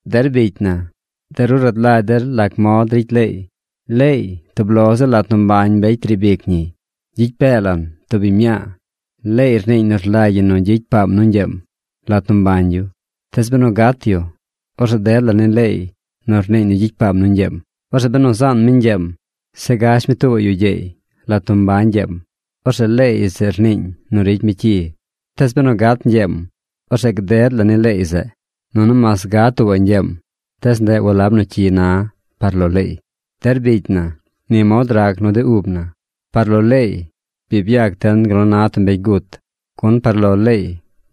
Der bicy na, de ru rad lagy der lac mod ricy leey. Leey, tub lo ziꞌl lat nu mbañ mbecy riib ic ñiy. Gyicy pee lan tub biñ mñaa. Leey rniiñ nu rlagy ñi nu gyicy paam nu ñgyeem lat nu mbañ yu. Tees benu gat yu, orzeꞌ ded la ni leey nu rniiñ nu gyicy paam nu ñgyeem. Orzeꞌ benu zaan mi ñgyeem, zeꞌ gash mi tuubaꞌ yu gyeey lat nu mbañ ñgyeem, orzeꞌ leey zeꞌ rniiñ nu ricy mi cyi. Tees benu gat ñgyeem, orzeꞌ gded la ni leey zeꞌ, nunu mas gad tuuba̱ꞌ ñgyeem, tees ndeꞌ walab nu cyi na par lo leey. Der bicy na, ni mod rac nu de ub na. Par lo leey bi byac den gal nu na tub mbecy gut, gun par lo leey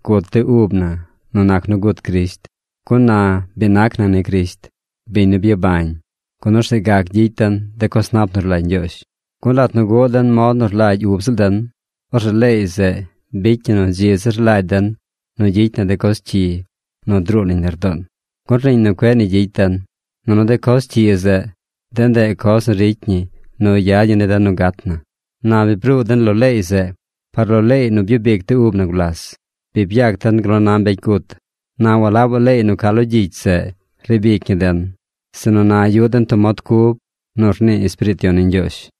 gut de ub na nu nac nu gut Crisht, gun na bi nac na ni Crisht, biñ nu byabañ, gun orzeꞌ gac gyicy den de coz nap nu rlagy Ñgyoozh. Gun lat nu guꞌ den mod nu rlagy ub ziꞌl den, orzeꞌ leey zeꞌ bicy ñi nu dzi zir rlagy den nu gyicy na de coz cyi nu druu nañ lardoon, gun rniiñ nu cueꞌ ni gyicy den. Nunu de coz cyi zeꞌ, de ndeꞌ coz nu ricy ñi nu yad ñi ni den nu gat na. Na bi bruu den lo leey zeꞌ. Par lo leey nu byub ic de ub na gulas, bi byac den gal nu na mbecy gut. Na walabaꞌ leey nu ca lo gyicy zeꞌ riib ic ñi den, sinu na yuꞌ den tub mod cub nu rnii Espiriit Yon ni Ñgyoozh.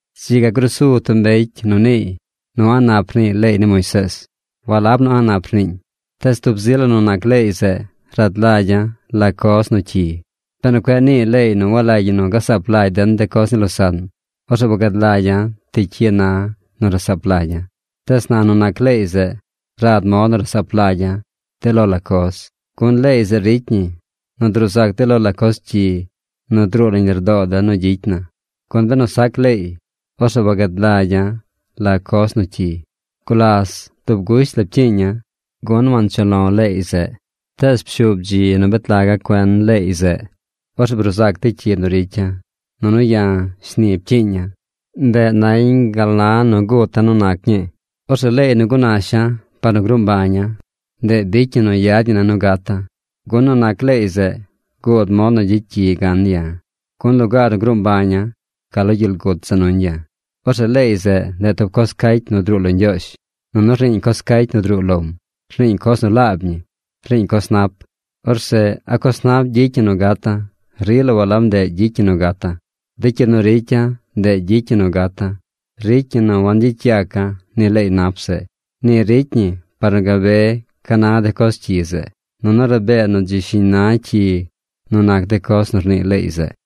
Dzi ga gruu su tub mbecy nu niiy nu a̱ꞌ nap rnii leey ni Moisees. ¡Walab nu a̱ꞌ nap rniiñ! Tees tub zi la nu nac leey zeꞌ rad lagya̱ la coz nu cyi. Benu cueꞌ nii leey nu walagy ñi gasaap lagy den de coz ni losaꞌn, orzeꞌ wagad lagya̱ ti cyi na nu rasaap lagya̱. Tees na nu nac leey zeꞌ, rad mod nu rasaap lagya̱ de lo la coz, gun leey zeꞌ ricy ñi nu druu zac de lo la coz cyi nu druu nañ lardoo den nu gyicy na. Gun benu sac leey, orzeꞌ wagad lagya̱ la coz nu cyi. Gulas dub gusht la pcyiiña̱, gun wanchuꞌ lo̱ leey zeꞌ. Tees pshuub dzi nu bet laga̱ cuen leey zeꞌ. Orzeꞌ bruu zac de cyi nu ricya̱. Nunu ya̱ shni pcyiiña̱. Ndeꞌ nañ gal na nu guta̱ nu nac ñii. Orzeꞌ leey nu gunasha̱ par nu gruu mbaña̱, ndeꞌ bicy ñi nu yad ñi ne̱ nu gata̱. Gun nu nac leey zeꞌ guud mod nu gyicy cyi gan ya̱, gun lugaar nu gruu mbaña̱, ca lo gyel gut za nuñ ya̱. Orzeꞌ leey zeꞌ, ndeꞌ tub coz cacy nu druu lo Ñgyoozh. Nunu rniiñ coz cacy nu druu lom. Rniiñ coz nu laab ñi. Rniiñ coz nap. Orzeꞌ ¿a coz nap gyicy ñi nu gata̱? ¡Rila walab ndeꞌ gyicy ñi nu gata̱! De cyi nu ricya̱, ndeꞌ gyicy ñi nu gata̱. Ricy ñi nu wangyicy yaca̱ ni leey nap zeꞌ. Ni ricy ñi par nu gabe ca na de coz cyi zeꞌ. Nunu rabee nu dzi shiñ na cyi nu nac de coz nu rnii leey zeꞌ.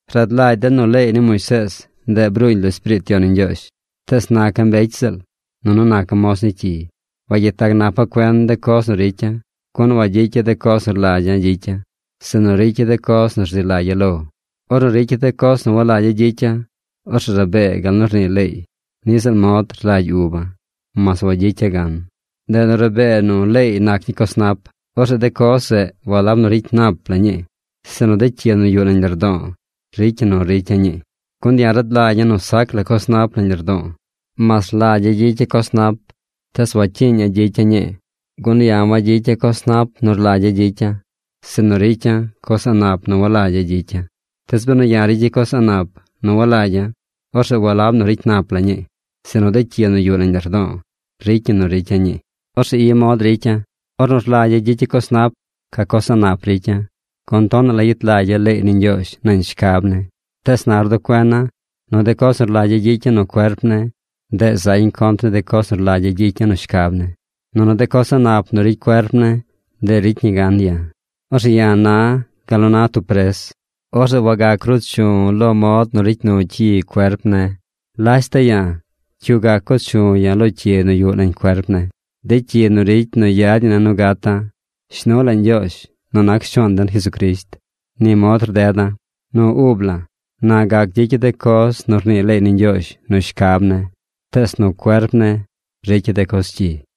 Rad lagy den nu leey ni Moisees, ndeꞌ bruuñ lo Espiriit Yon ni Ñgyoozh. Tees naca̱ mbecy ziꞌl. Nunu naca̱ moz ni cyi. Wagyet lag napa̱ cuen de coz nu ricya̱, gun wagyicya̱ de coz nu rlagya̱ gyicya̱, sinu ricya̱ de coz nu rzi lagya̱ lo̱. Ornu ricya̱ de coz nu walagya̱ gyicya̱, orzeꞌ rabee gal nu rnii leey, niꞌ ziꞌl mod rlagy uba̱, mas wagyicya̱ gan. Ndeꞌ nu rabee nu leey nac ñii coz nap. Orzeꞌ de coz zeꞌ walab nu ricy nap la̱ ñii, sinu de cyi nu yuꞌ nañ lardo̱o̱ ricy ñi nu ricya̱ ñii. Gun ya̱ rad lagya̱ nu sac la coz nap nañ lardo̱o̱. Mas rlagya̱ gyicya̱ coz nap tees wacyiiña̱ gyicya̱ ñii. Gun ya̱ wagyicya̱ coz nap nu rlagya̱ gyicya̱, sinu ricya̱ coz a̱ꞌ nap nu walagya̱ gyicya̱. Tees benu ya̱ ricya̱ coz a̱ꞌ nap nu walagya̱, orzeꞌ walab nu ricy nap la ñii, sinu de cyi nu yuꞌ nañ lardo̱o̱ ricy ñi nu ricya̱ ñii. Orzeꞌ i mod nu ricya̱: Ornu rlagya̱ gyicya̱ coz nap, ca coz a̱ꞌ nap ricya̱. Gun tonaꞌ la yet lagya̱ leey ni Ñgyoozh nañ shcab ne̱. Tees na rduꞌ cuena̱ nu de coz nu rlagya̱ gyicya̱ nu cuerp ne̱, ndeꞌ zañ contr ni de coz nu rlagya̱ gyicya̱ nu shcab ne̱. Nunu de coz a̱ꞌ nap nu ricy cuerp ne̱, ndeꞌ ricy ñi gan ya̱. Orzeꞌ ya̱ na gal nu na tub pres. Orzeꞌ wagac ruu chu̱ lo mod nu ricy nu cyi cuerp ne̱. ¡Lashta ya̱! ¿Cyu gac co chu ya̱ lo cyi nu yuꞌ nañ cuerp ne̱, de cyi nu ricy nu yad ñi ne̱ nu gata̱? ¡Shnu la Ñgyoozh nu nac Shuaan den Jesucrisht! Ni mod rdeda̱: Nu ub la̱, na gac gyicya̱ de coz nu rnii leey ni Ñgyoozh nu shcab ne̱, tees nu cuerp ne̱, ricya̱ de coz cyi.